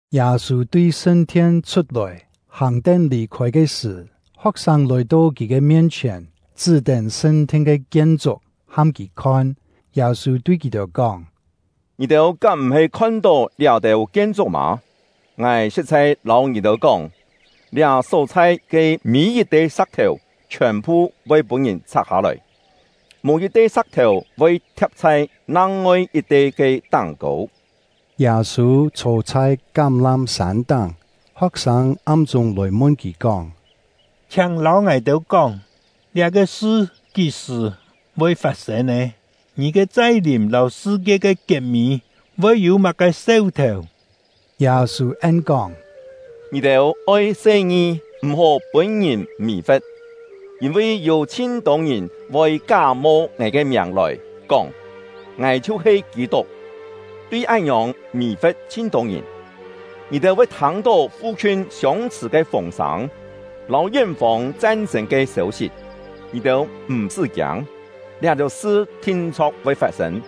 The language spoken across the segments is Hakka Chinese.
Yâ-sû tui sṳn-thien chhut-lòi, hàng-tén lì-khôi ke sṳ̀, ho̍k-sâng lòi-to kì ke mien-chhièn, chṳ́-tén sṳn-thien ke kien-chuk ham kì khon. Yâ-sû tui kì-têu kóng: “Ngì-têu kám m̀-he khon-tó liá-têu kien-chuk mâ? Ngài sṳ̍t-chhai lâu ngì-têu kóng, liá só-chhai ke mî yit-te sa̍k-thèu chhiòn-phu voi pûn-ngìn chhak-hâ-lòi, mò yit-te sa̍k-thèu voi thia̍p chhai nang-ngoi yit-te ke táng-kô.” Yâ-sû chhô chhai Kám-lám-sân táng, ho̍k-sâng am-chûng lòi mun kì kóng: “Chhiáng lâu ngài-têu kóng, liá-ke sṳ kí-sṳ̀ voi fat-sên nè? Ngì ke chai-lìm lâu sṳ-kie ke kiet-mî voi yû má-ke seu-thèu?” Yâ-sû en-kóng: “Ngì-têu oi se-ngi, m̀-hó pûn-ngìn mì-fe̍t. Yîn-vi yû chhin-tô ngìn voi ká-mo ngài ke miàng lòi, kóng: ‘Ngài chhiu-he Kî-tuk!’ tui án-ngiòng mì-fe̍t chhin-tô ngìn. Ngì-têu voi thâng-tó fu-khiun siông-chhṳ̀ ke fûng-sâng lâu yén-fông chan-chên ke sêu-sit. Ngì-têu m̀-sṳ́ kiâng, liá-têu sṳ thin-chho̍k voi fat-sên;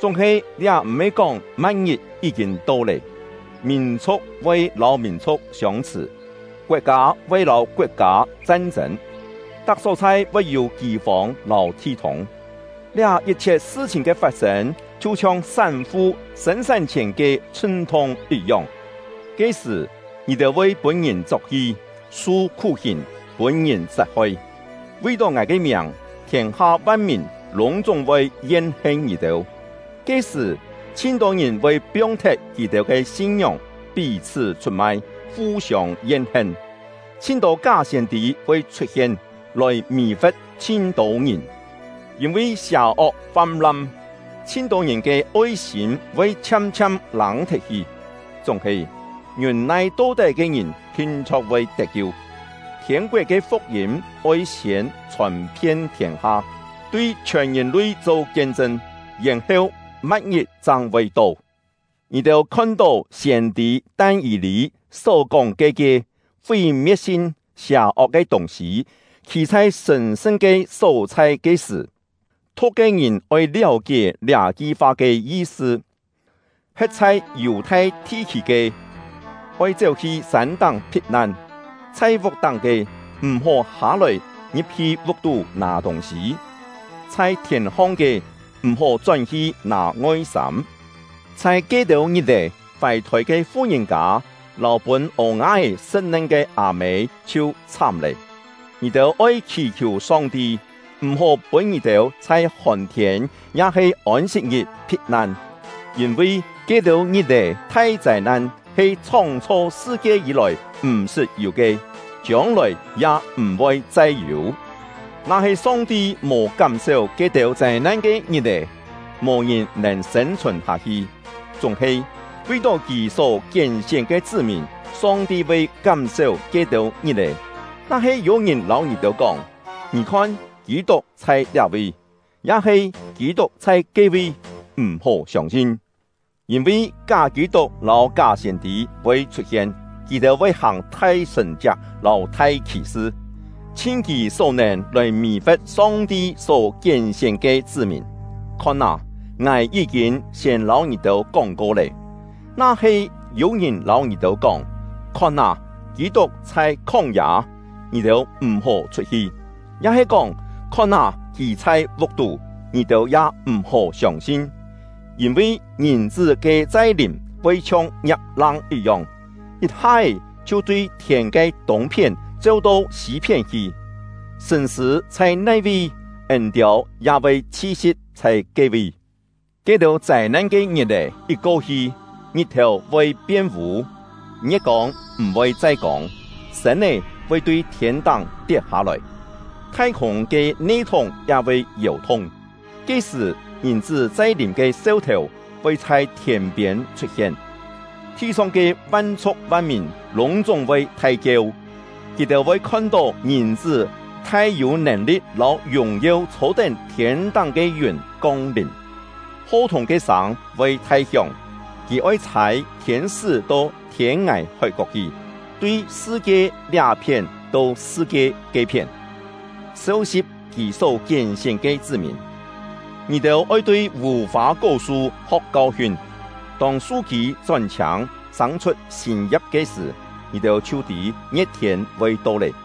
chúng-he liá m̀-he kóng ma̍t-ngit yí-kîn to lé. Mìn-chhu̍k voi lâu mìn-chhu̍k siông-chhṳ̀; koet-kâ voi lâu koet-kâ chan-chên; tak só-chhai voi yû kî-fông lâu thi-thûng. Liá yit-chhiet sṳ-chhìn ke fat-sên chhiu-chhiong sán-fu sên-sán-chhièn ke chhṳn-thung yit-yong. “Ke-sṳ̀, ngì-têu voi pûn-ngìn chok-hi, su khú-hìn, pûn-ngìn sat-hoi. Vi-tó ngài ke miàng, thiên-ha van-mìn lûng-chúng voi yen-hen ngì-têu. Ke-sṳ̀, chhin-tô ngìn voi piong-thet kì-têu ke sin-ngióng, pí-chhṳ́ chhut-mai, fu-siông yen-hen. Chhin-tô ká siên-tî voi chhut-hien, lòi mì-fe̍t chhin-tô ngìn. Yîn-vi sià-ok fam-lam, chhin-tô ngìn ke oi-sîm voi chhiam-chhiam lâng-thet-hi. Chúng-he, ngiûn-nai to-tái ke ngìn thin-chho̍k voi tet-kiu. Thiên-koet ke fuk-yîm oi siên chhòn-phien thiên-ha, tui chhiòn ngìn-lui cho kien-chṳn, yèn-heu ma̍t-ngit chang voi to. “Ngì-têu khon-tó siên-tî Tan-yî-lî só kóng ke ke ‘Fí-me̍t-sin, sià-ok ke tûng-sî’ khî chhai sṳ̀n-sṳn ke só-chhai ke sṳ̀ (thu̍k ke ngìn oi liáu-kié liá-ki fa ke yi-sṳ), he̍t chhai Yù-thai thi-khî ke, oi chéu-hi sân-táng phit-nan; chhai vuk-táng ke, m̀-hó hâ-lòi ngi̍p-hi vuk-tú nâ tûng-sî; chhai thièn-hong ke, m̀-hó chón-hi nâ ngoi-sâm. Chhai ke-têu ngit-è, fài-thôi ke fu-ngìn-kâ lâu pûn ô-nga-é sṳ̍t-nen ke â-mê chhiu chhám lé! Ngì-têu oi khì-khiù Song-ti, m̀-hó pûn ngì-têu chhai hòn-thiên ya-he Ôn-sit-ngit phit-nan. Yîn-vi ke-têu ngit-è ke thai châi-nan he chhóng-chho sṳ-kie yî-lòi m̀-sṳt yû ke, chiông-lòi ya m̀-voi chai yû. Na-he Song-ti mò kám-séu ke-têu châi-nan ke ngit-è, mò ngìn nèn sên-chhùn hâ-hi. Chúng-he, vi-tó Kì só kién-sién ke chṳ́-mìn, Song-ti voi kám-séu ke-têu ngit-è. “Na-he yû-ngìn lâu ngì-têu kóng: ‘Ngì khon, Kî-tuk chhai liá-vi!’ ya-he ‘Kî-tuk chhai ke-vi!’ m̀-hó siông-sin. Yîn-vi ká Kî-tuk lâu ká siên-tî voi chhut-hien, kì-têu voi hàng thai sṳ̀n-chiak lâu thai khì-sṳ, chhin kì só-nèn lòi mì-fe̍t Song-ti só kién-sién ke chṳ́-mìn. Khon â, ngài yí-kîn siên lâu ngì-têu kóng-ko lé. “Na-he yû-ngìn lâu ngì-têu kóng: ‘Khon â, Kî-tuk chhai khóng-yâ!’ ngì-têu m̀-hó chhut-hi; ya-he kóng: ‘Khon â, kì chhai vuk-tú!’ ngì-têu ya m̀-hó siông-sin. Yîn-vi Ngìn-chṳ́ ke chai-lìm voi chhiong ngiap-lang yit-yong, yit-ha-é chhiu tui thiên ke tûng-phién cheu-to sî-phién hi. “Sṳ̂n-sṳ̂ chhai nai-vi, yîn-tiâu ya voi chhi-si̍p chhai ke-vi. “Ke-têu châi-nan ke ngit-è yit ko-hi, ngit-thèu voi pien vû, ngie̍t-kông m̀-voi chai kông, sên-é voi tui thiên-táng tiet-hâ-lòi, thai-khûng ke ne-thúng ya voi yèu-thung. Ke-sṳ̀, Ngìn-chṳ́ chai-lìm ke seu-thèu voi chhai thiên-piên chhut-hien. Thi-song ke van-chhu̍k van-mìn lûng-chúng voi thai-kieu; kì-têu voi khon-tó Ngìn-chṳ́ thai-yû nèn-li̍t lâu yùng-yeu chhô-tén thiên-táng ke yùn kong-lìm. Ho-thùng ke sâng voi thai-hióng, kì oi chhâi thiên-sṳ́ to thiên-ngài hói-kok hi, tui sṳ-kie liá-phién to sṳ-kie ke-phién, seu-si̍p kì só kién-sién ke chṳ́-mìn. “Ngì-têu oi tui vù-fâ-kó-su ho̍k kau-hiun. Tông su-kî chón-chhiâng, sâng-chhut sîn ya̍p ke sṳ̀, ngì-têu chhiu tî ngie̍t-thiên voi to lé.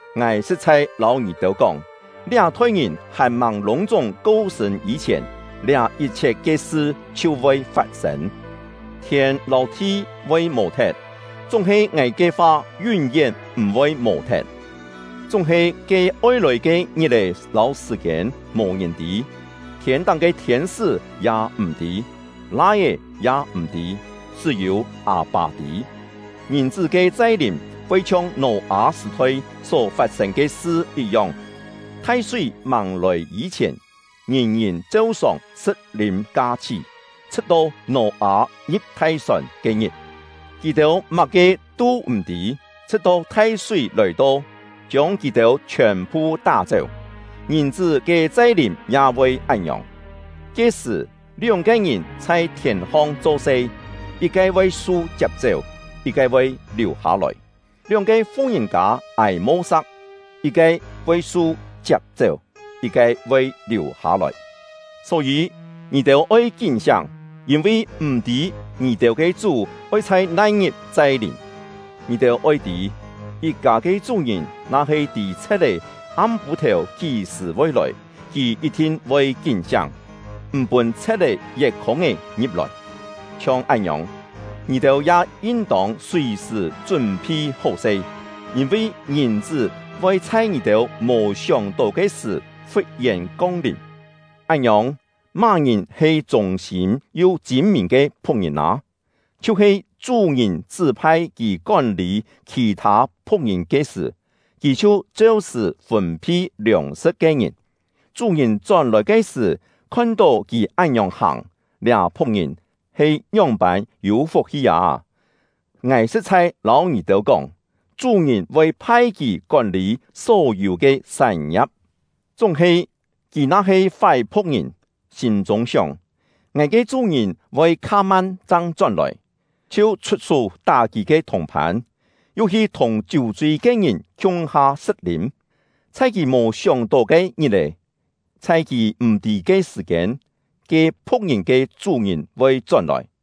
Ngài sṳ̍t-chhai lâu ngì-têu kóng, liá-thoi ngìn hàn-màng lûng-chúng ko-sṳ̂n yî-chhièn, liá yit-chhiet ke sṳ chhiu voi fat-sên. Thiên lâu thi voi mò-thet, chúng-he ngài ke fa yún-yén m̀-voi mò-thet. “Chúng-he ke oi lòi ke ngit-è lâu sṳ̀-kiên, mò ngìn tî; thiên-táng ke thiên-sṳ́ ya m̀-tî, Lai-é ya m̀-tî Yû-têu kú-kién mò “Lai-é ya m̀-tî”., chṳ́-yû Â-pâ tî. Ngìn-chṳ́ ke chai-lìm voi chhiong Nò-â sṳ̀-thoi só fat-sên ke sṳ yit-yong. Thai-súi màng lòi yî-chhièn, ngìn-ngìn cheu-sòng sṳ̍t-lîm ka-chhí, chhṳ̍t-to Nò-â ngi̍p thai-sòn ke-ngit; kì-têu má-ke tû m̀-tî, chhṳ̍t-to thai-súi lòi-to, chiông kì-têu chhiòn-phu tá-chéu. Ngìn-chṳ́ ke chai-lìm ya voi án-ngiòng. Ke-sṳ̀, lióng-ke ngìn chhai thièn-hong cho-se, yit-ke voi su chiap-chéu, yit-ke voi liù-hâ-lòi; lióng-ke fu-ngìn-kâ âi mo-sa̍k, yit-ke voi su chiap-chéu, yit-ke voi liù-hâ-lòi. Só-yî, ngì-têu oi kín-siáng, yîn-vi m̀-tî ngì-têu ke Chú oi chhai nai-ngit chai-lìm. Ngì-têu oi tî: Yit-kâ ke chú-ngìn na-he tî chhe̍t-é am-pû-thèu kí-sṳ̀ voi lòi, kì yit-thin voi kín-siáng, m̀ pûn chhe̍t-é yet khûng-é ngi̍p-lòi. Chhiong án-ngiòng, ngì-têu ya yin-tông sùi-sṳ̀ chún-phi hó-se, yîn-vi Ngìn-chṳ́ voi chhai ngì-têu mò sióng-tó ke sṳ̀ fut-yèn kong-lìm. “Án-ngiòng, má-ngìn he chûng-sîm yu chîn-mìn ke phu̍k-ngìn â? Chhiu-he chú-ngìn chṳ́-phai kì kón-lî khì-thâ phu̍k-ngìn ke sṳ̀, kì chhiu cheu-sṳ̀ fûn-phi liòng-sṳ̍t ke ngìn. Chú-ngìn chón-lòi ke sṳ̀, khon-tó kì án-ngiòng hàng, liá phu̍k-ngìn he ngióng-pân yû fuk-hi â! Ngài sṳ̍t-chhai lâu ngì-têu kóng, chú-ngìn voi phai kì kón-lî só-yû ke sán-ngia̍p. Chúng-he, kì na-he fái phu̍k-ngìn, sîm-chûng sióng: ‘Ngài ke chú-ngìn voi kha-man chang chón-lòi’, chhiu chhut-sú tá kì ke thùng-phân, yu hi thùng chiú-chui ke ngìn khiung-ha sṳ̍t-lîm, chhai kì mò sióng-tó ke ngit-è, chhai kì m̀-tî ke sṳ̀-kiên, ke phu̍k-ngìn ke chú-ngìn voi chón-lòi,